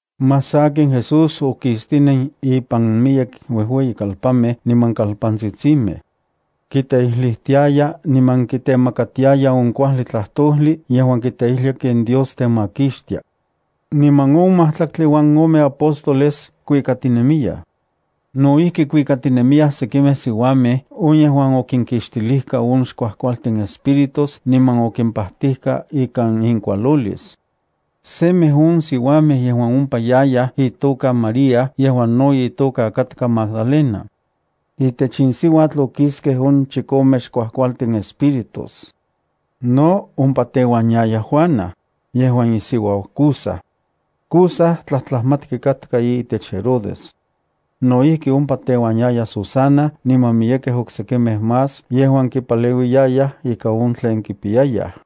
Más sakin Jesús okistinen ipan miyek uejueyikalpanmej niman kalpantsitsimej. Kiteijlijtiaya niman kitemakatiaya on kuajli tlajtojli yejuan kiteijlia ken Dios temakixtia. Niman on majtlaktli uan ome apóstoles kuikatinemiyaj. No ijki kuikatinemiya sekimej siuamej on yejuan okinkixtilijka on xkuajkualtin espíritus niman okimpajtijka ika inkualolis. Semej on siuamej yejuan ompa yayaj itoka María yejuan no itoka katka Magdalena. Itech in siuatl okiskej on chikome xkuajkualtin espíritus. No, ompa teuan yaya Juana, yejuan isiuau Cuza. Cuza tlajtlajmatki katka itech Herodes. No ijki ompa teuan yaya Susana niman miyekej oksekimej más yejuan kipaleuiyayaj ikan on tlen kipiyayaj.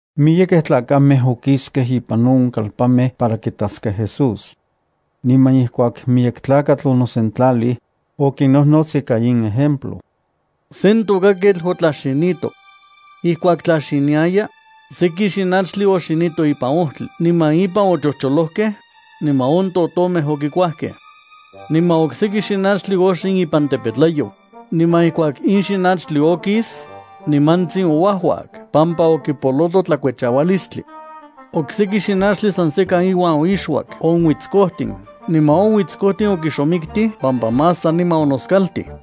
Miyekej tlakamej okiskej ipan on kalpanmej para kitaskej Jesús. Niman ijkuak miyek tlakatl onosentlalij, okinnojnots ika in ejemplo: —Sen tokaketl otlaxinito. Ijkuak tlaxiniaya, seki xinachtli oxinito ipan ojtli niman ipan ochojcholojkej, niman on totomej okikuajkej. Niman okseki xinachtli oxin ipan tepetlayoj, niman ijkuak in xinachtli okis, nimantsin ouajuak pampa okipoloto tlakuechaualistli. Okseki xinachtli san sekan iuan oixuak on uitskojtin niman on uitskojtin okixomiktij pampa mas saniman onoskaltij.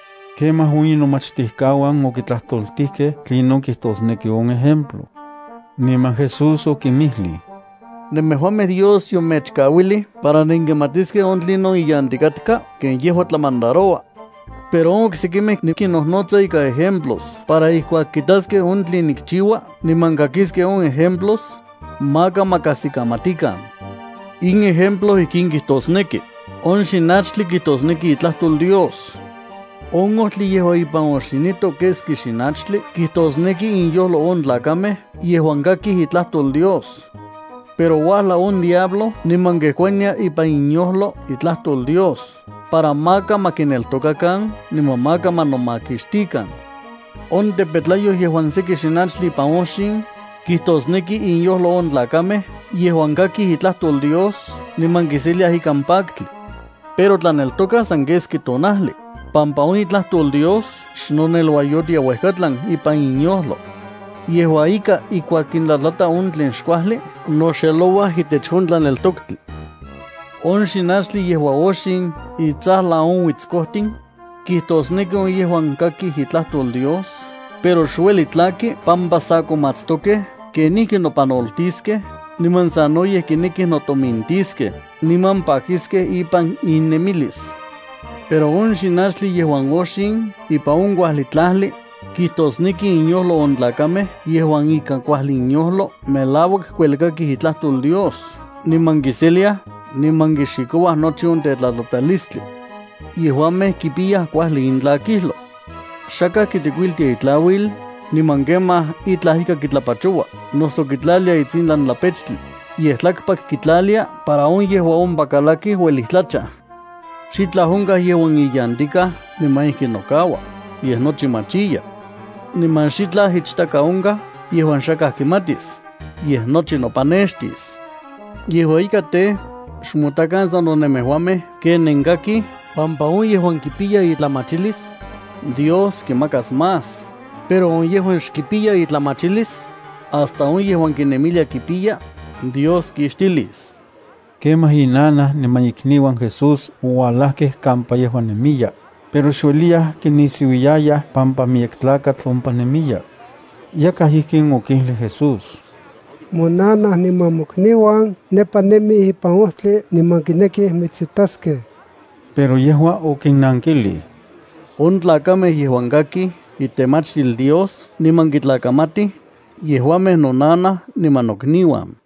Kemaj on inomachtijkauan okitlajtoltijkej tlinon kijtosneki on ejemplo. Niman Jesús okinmijlij: —Nemejuamej Dios yomechkauilij para nenkimatiskej on tlinon iyantikaj ken yejua tlamandaroua. Pero on oksekimej nikinnojnotsa ikan ejemplos para ijkuak kitaskej on tlen nikchiua niman kakiskej on ejemplos, maka ma kajsikamatikan. ’In ejemplo ijkin kijtosneki: On xinachtli kijtosneki itlajtol Dios. On ojtli yejuan ipan oxinito keski xinachtli kijtosneki inyojlo on tlakamej yejuan kakij itlajtol Dios. Pero uajlau on diablo niman kejkuania ipan inyojlo itlajtol Dios para maka ma kineltokakan niman maka ma nomakixtikan. On tepetlayoj yejuan seki xinachtli ipan oxin, kijtosneki inyojlo on tlakamej yejuan kakij itlajtol Dios niman kiseliaj ikan paktli. Pero tlaneltokaj san keski tonajli, pampa on itlajtol Dios xnoneluayotia uejkatlan ipan inyojlo. Yejua ika ijkuak kintlatlata on tlen xkuajli, noxelouaj itech on tlaneltoktli. On xinanchtli yejuan oxin itsajlan on uitskojtin, kijtosneki on yejuan kakij itlajtol Dios, pero xueli tlaki pampa sa komatstokej kenijki nopanoltiskej niman sanoyej kinekij notomintiskej niman pakiskej ipan innemilis. Pero on xinanchtli yejuan oxin ipan on kuajli tlajli, kijtosneki inyojlo on tlakamej yejuan ikan kuajli inyojlo melauak kuelkakij itlajtol Dios niman kiseliaj niman kixikouaj nochi on tetlatlatalistli. Yejuamej kipiyaj kuajli intlakijlo. ’Xakaj kitlikuiltia itlauil niman kemaj itlaj ika kitlapachoua noso kitlalia itsintlan tlapechtli, yej tlakpak kitlalia para on yejuan ompa kalakij uelij tlachaj. Xitlaj onkaj yejuan iyantikaj niman ijki nokaua, yej nochi machiya. Niman xitlaj ichtaka onkaj yejuan xakaj kimatis, yej nochi nopanextis. ’Yejua ika tej, xmotakan sano nemejuamej ken nenkakij pampa on yejuan kipiya itlamachilis, Dios kimakas más, pero on yejuan xkipiya itlamachilis, hasta on yejuan kinemilia kipiya, Dios kixtilis. Kemaj inanaj niman ikniuan Jesús oualajkej kampa yejua nemiya, pero xueliyaj kinisiuiyayaj pampa miyek tlakatl ompa nemiya. Yakaj ijkin okijlij Jesús: —Monanaj niman mokniuan nepa nemij ipan ojtli niman kinekij mitsitaskej. Pero yejua okinnankijlij: —On tlakamej yejuan kakij itemachtil Dios niman kitlakamatij, yejuamej nonanaj niman nokniuan.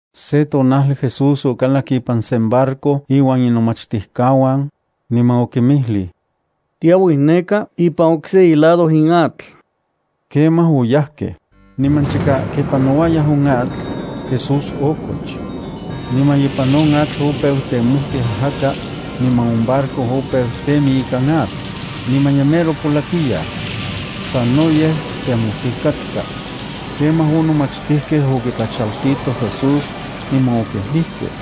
Se tonajli Jesús okalak ipan sen barco iuan inomachtijkauan, niman okinmijlij: —Tiauij neka ipan okse ilado in atl. Kemaj oyajkej. Niman chika kipanouayaj on atl, Jesús okoch. Niman ipan on atl opeu temojtij ajaka, niman on barco opeu temi ikan atl, niman ye mero polakiyaj. Sanoyej temojtij katka. Kemaj on nomachtijkej okitlachaltitoj Jesús, niman okijlijkej: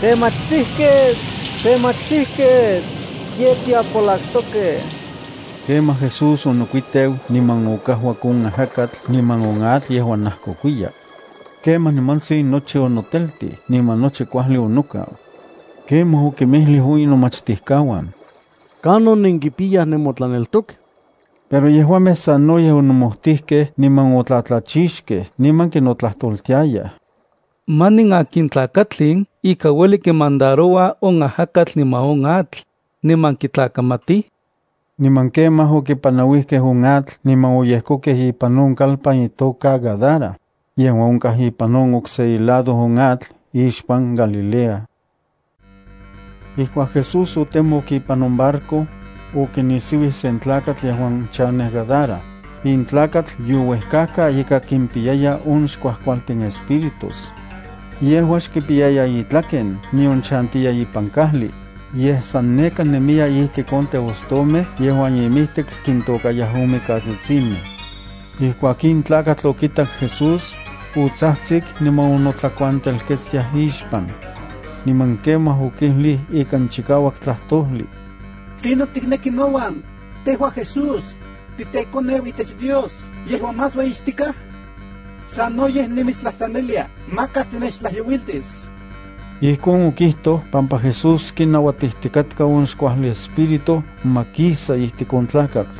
—¡Temachtijketl! ¡Temachtijketl! ¡Ye tiapolaktokej! Kemaj Jesús onokuiteu niman okajuak on ajakatl niman on atl yejuan najkokuiya. Kemaj, nimantsin nochi onoteltij niman nochi kuajli onokau. Kemaj okinmijlij on inomachtijkauan: —¿Kanon nenkipiyaj nemotlaneltok? Pero yejuamej sanoyej onomojtijkej, niman otlatlachixkej, niman kinotlajtoltiayaj: —¿Manin akin tlakatl in ika ueli kimandaroua on ajakatl niman on atl, niman kitlakamatij? Niman kemaj okipanauijkej on atl niman oyejkokej ipan on kalpan itoka Gadara, yejuan onkaj ipan on okse ilado on atl ixpan Galilea. Ijkuak Jesús otemok ipan on barco, okinisiuij sen tlakatl yejuan chanej Gadara. In tlakatl youejkajka ika kimpiyaya on xkuajkualtin espíritus. Yejua xkipiyaya itlaken nion chantiya ipan kajli, yej san neka nemiya ijtik on teostomej yejuan imijtik kintokayaj on mikatsitsimej. Ijkuak in tlakatl okitak Jesús, otsajtsik niman onotlakuantelketstiaj ixpan. Niman kemaj okijlij ikan chikauak tlajtojli: —¿Tlinon tikneki nouan, tejua Jesús, titeKoneu itech Dios yejuan más ueyixtikaj? Sanoyej nimitstlajtlanilia maka tinechtlajyouiltis. Ijkon okijtoj pampa Jesús kinauatijtikatka on xkuajli espíritu ma kisa ijtik on tlakatl.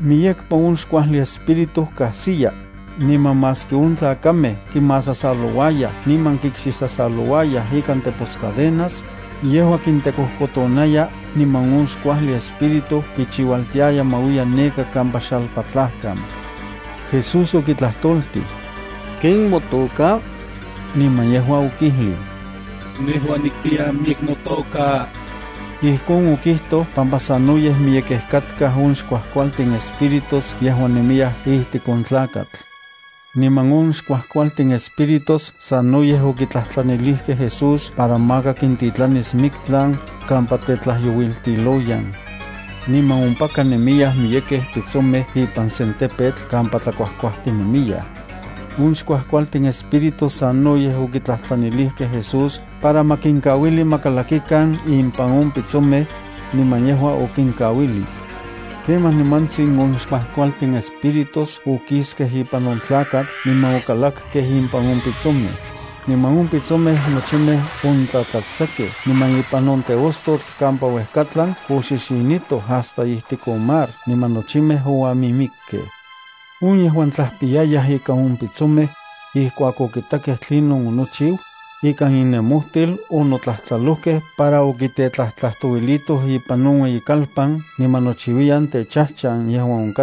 Miyekpa on xkuajli espíritu kajsiya, niman maski on tlakamej kimasasalouayaj niman kikxisasalouayaj ikan teposcadenas, yejua kintekojkotonaya niman on xkuajli espíritu kichiualtiaya ma uiya neka kampa xalpatlajkan. Jesús okitlajtoltij: —¿Ken motoka? Niman yejua okijlij: —Nejua nikpiya miyek notoka. Ijkon okijtoj pampa sanoyej miyekej katkaj on xkuajkualtin espíritus yejuan nemiyaj ijtik on tlakatl. Niman on xkuajkualtin espíritus sanoyej okitlajtlanilijkej Jesús para maka kintitlanis miktlan kampa tetlajyouiltiloyan. Niman ompaka nemiyaj miyekej pitsomej ipan sen tepetl kampa tlakuajkuajtinemiyaj. On xkuajkualtin espíritus sanoyej okitlajtlanilijkej Jesús para ma kinkauili ma kalakikan impan on pitsomej, niman yejua okinkauilij. Kemaj nimantsin on xkuajkualtin espíritus okiskej ipan on tlakatl niman okalakkej impan on pitsomej. Niman on pitsomej nochimej ontlatlaktsakej niman ipan on teostotl kampa uejkatlan oxixinitoj hasta ijtik on mar niman nochimej oamimikkej. On yejuan tlajpiyayaj ikan on pitsomej, ijkuak okitakej tlinon onochiu, ikan innemojtil onotlajtlalojkej para okitetlajtlajtouilitoj ipan on ueyikalpan niman nochiuiyan kampa chajchantiua.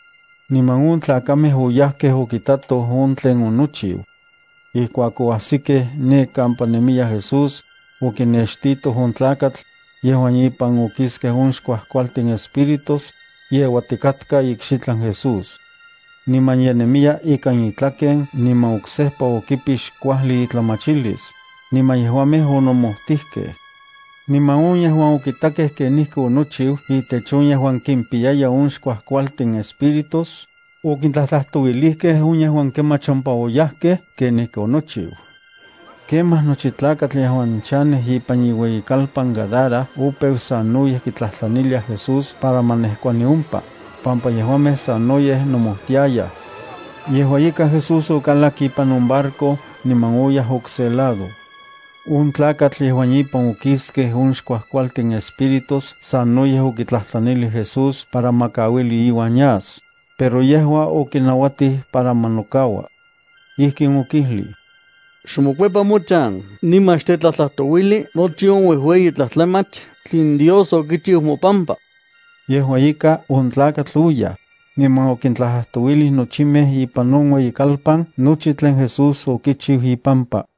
Niman on tlakamej oyajkej okitatoj on tlen onochiu. Ijkuak oajsikej ne kampa nemiya Jesús, okinextitoj on tlakatl, yejuan ipan okiskej on xkuajkualtin espíritus, yeuatikatka ikxitlan Jesús. Niman ye nemiya ikan itlaken niman oksejpa okipix kuajli itlamachilis, niman yejuamej onomojtijkej. Niman on yejuan okitakej kenijki onochiu itech on yejuan kimpiyaya on xkuajkualtin espíritus, okintlajtlajtouilijkej on yejuan kemach ompa oyajkej kenijki onochiu. Kemaj nochi tlakatl yejuan chanej ipan iueyitlalpan Gadara opeu sanoyej kitlajtlaniliaj Jesús para ma nejkuani ompa, pampa yejuamej sanoyej nomojtiayaj. Yejua ika Jesús okalak ipan on barco niman oyaj okse lado. On tlakatl yejuan ipan okiskej on xkuajkualtin espíritus sanoyej okitlajtlanilij Jesús para ma kauili iuan yas, pero yejua okinauatij para ma nokaua. Ijkin okijlij: —Xmokuepa mochan niman xtetlajtlajtouili nochi on uejueyi tlajtlamach tlen Dios okichiu mopampa. Yejua ika, on tlakatl oyaj, niman okintlajtlajtouilij nochimej ipan on ueyikalpan nochi tlen Jesús okichiu ipampa.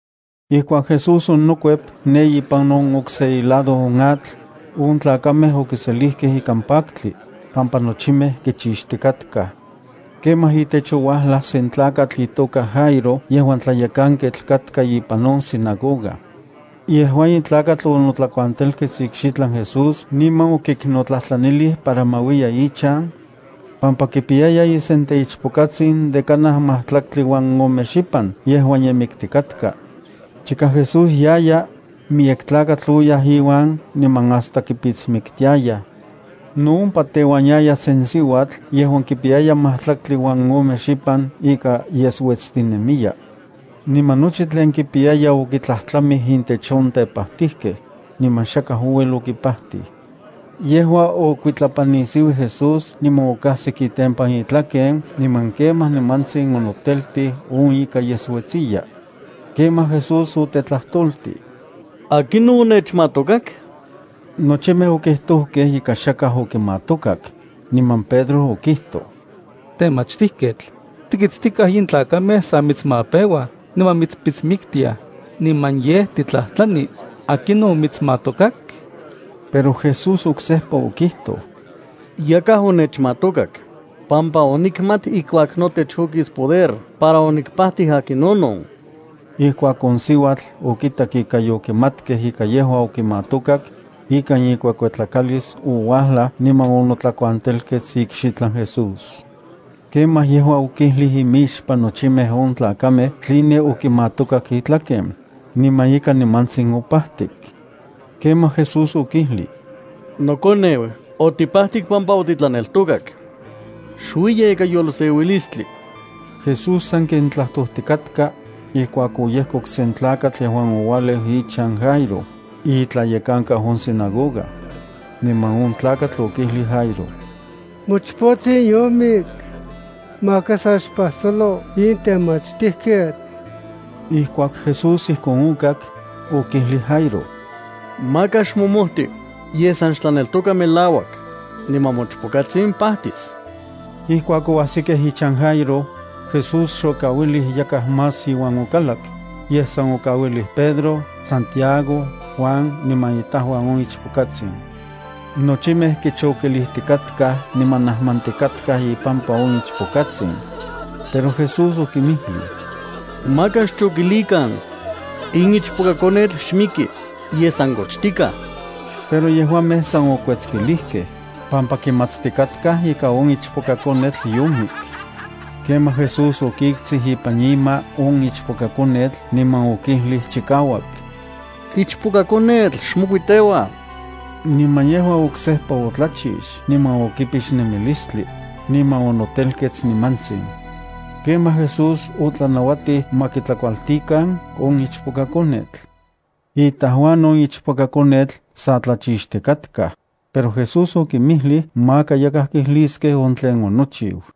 Ijkuak Jesús onokuep ne ipan on okse ilado on atl, on tlakamej okiselijkej ikan paktli, pampa nochimej kichixtikatkaj. Kemaj itech ouajlaj sen tlakatl itoka Jairo yejuan tlayekanketl katka ipan on sinagoga. Yejua in tlakatl onotlakuantelkets ikxitlan Jesús niman okiknotlajtlanilij para ma uiya ichan, pampa kipiyaya isenteichpokatsin de kanaj majtlaktli uan ome xipan yejuan ye miktikatka. Chika Jesús yaya, miyek tlakatl oyaj iuan niman hasta kipitsmiktiayaj. No ompa teuan yaya sen siuatl yejuan kipiya majtlaktli uan ome xipan ika yesuetstinemiya. Niman nochi tlen kipiyaya okitlajtlamij intech on tepajtijkej, niman xakaj ouel okipajtij. Yejua okuitlapannisiuij Jesús niman okajsik itempan itlaken niman kemaj nimantsin onoteltij on ika yesuetsiya. Kemaj Jesús otetlajtoltij: —¿Akinon onechmatokak? Nochimej okijtojkej ika xakaj okimatokak, niman Pedro okijtoj: —Temachtijketl, tikitstikaj in tlakamej sa mitsmapeuaj niman mitspitsmiktiaj, niman yej titlajtlani: ¿akinon omitsmatokak? Pero Jesús oksejpa okijtoj: —Yakaj onechmatokak, pampa onikmat ijkuak notech okis poder para onikpajtij akinonon. Ijkuak on siuatl okitak ika yokimatkej ika yejua okimatokak, ikan ikuekuetlakalis ouajlaj niman onotlakuantelkets ikxitlan Jesús. Kemaj yejua okijlij imixpan nochimej on tlakamej tline okimatokak itlaken, niman ika nimantsin opajtik. Kemaj Jesús okijlij: —Nokoneu, otipajtik pampa otitlaneltokak. Xuiya ikan yolseuilistli. Jesús sanken tlajtojtikatka, ijkuak oyejkok sen tlakatl yejuan oualeu ichan Jairo, itlayekankau on sinagoga. Niman on tlakatl okijlij Jairo: —Mochpotsin yomik. Maka sa xpajsolo in temachtijketl. Ijkuak Jesús ijkon okak, okijlij Jairo: —Maka xmomojti, yej san xtlaneltoka melauak, niman mochpokatsin pajtis. Ijkuak oajsikej ichan Jairo, Jesús xokauilij yakaj más iuan okalak, yej san okauilij Pedro, Santiago, Juan niman itajuan on ichpokatsin. Nochimej kichokilijtikatkaj niman najmantikatkaj ipampa on ichpokatsin. Pero Jesús okinmijlij: —Maka xchokilikan. In ichpokakonetl xmiki, yej san kochtikaj. Pero yejuamej san okuetskilijkej, pampa kimatstikatkaj ika on ichpokakonetl yomik. Kemaj Jesús okiktsij ipan ima on ichpokakonetl niman okijlij chikauak: —Ichpokakonetl, xmokuiteua. Niman yejua oksejpa otlachix niman okipix nemilistli, niman onotelkets nimantsin. Kemaj Jesús otlanauatij ma kitlakualtikan on ichpokakonetl. Itajuan on ichpokakonetl sa tlachixtikatkaj, pero Jesús okinmijlij maka yakaj kijliskej on tlen onochiu.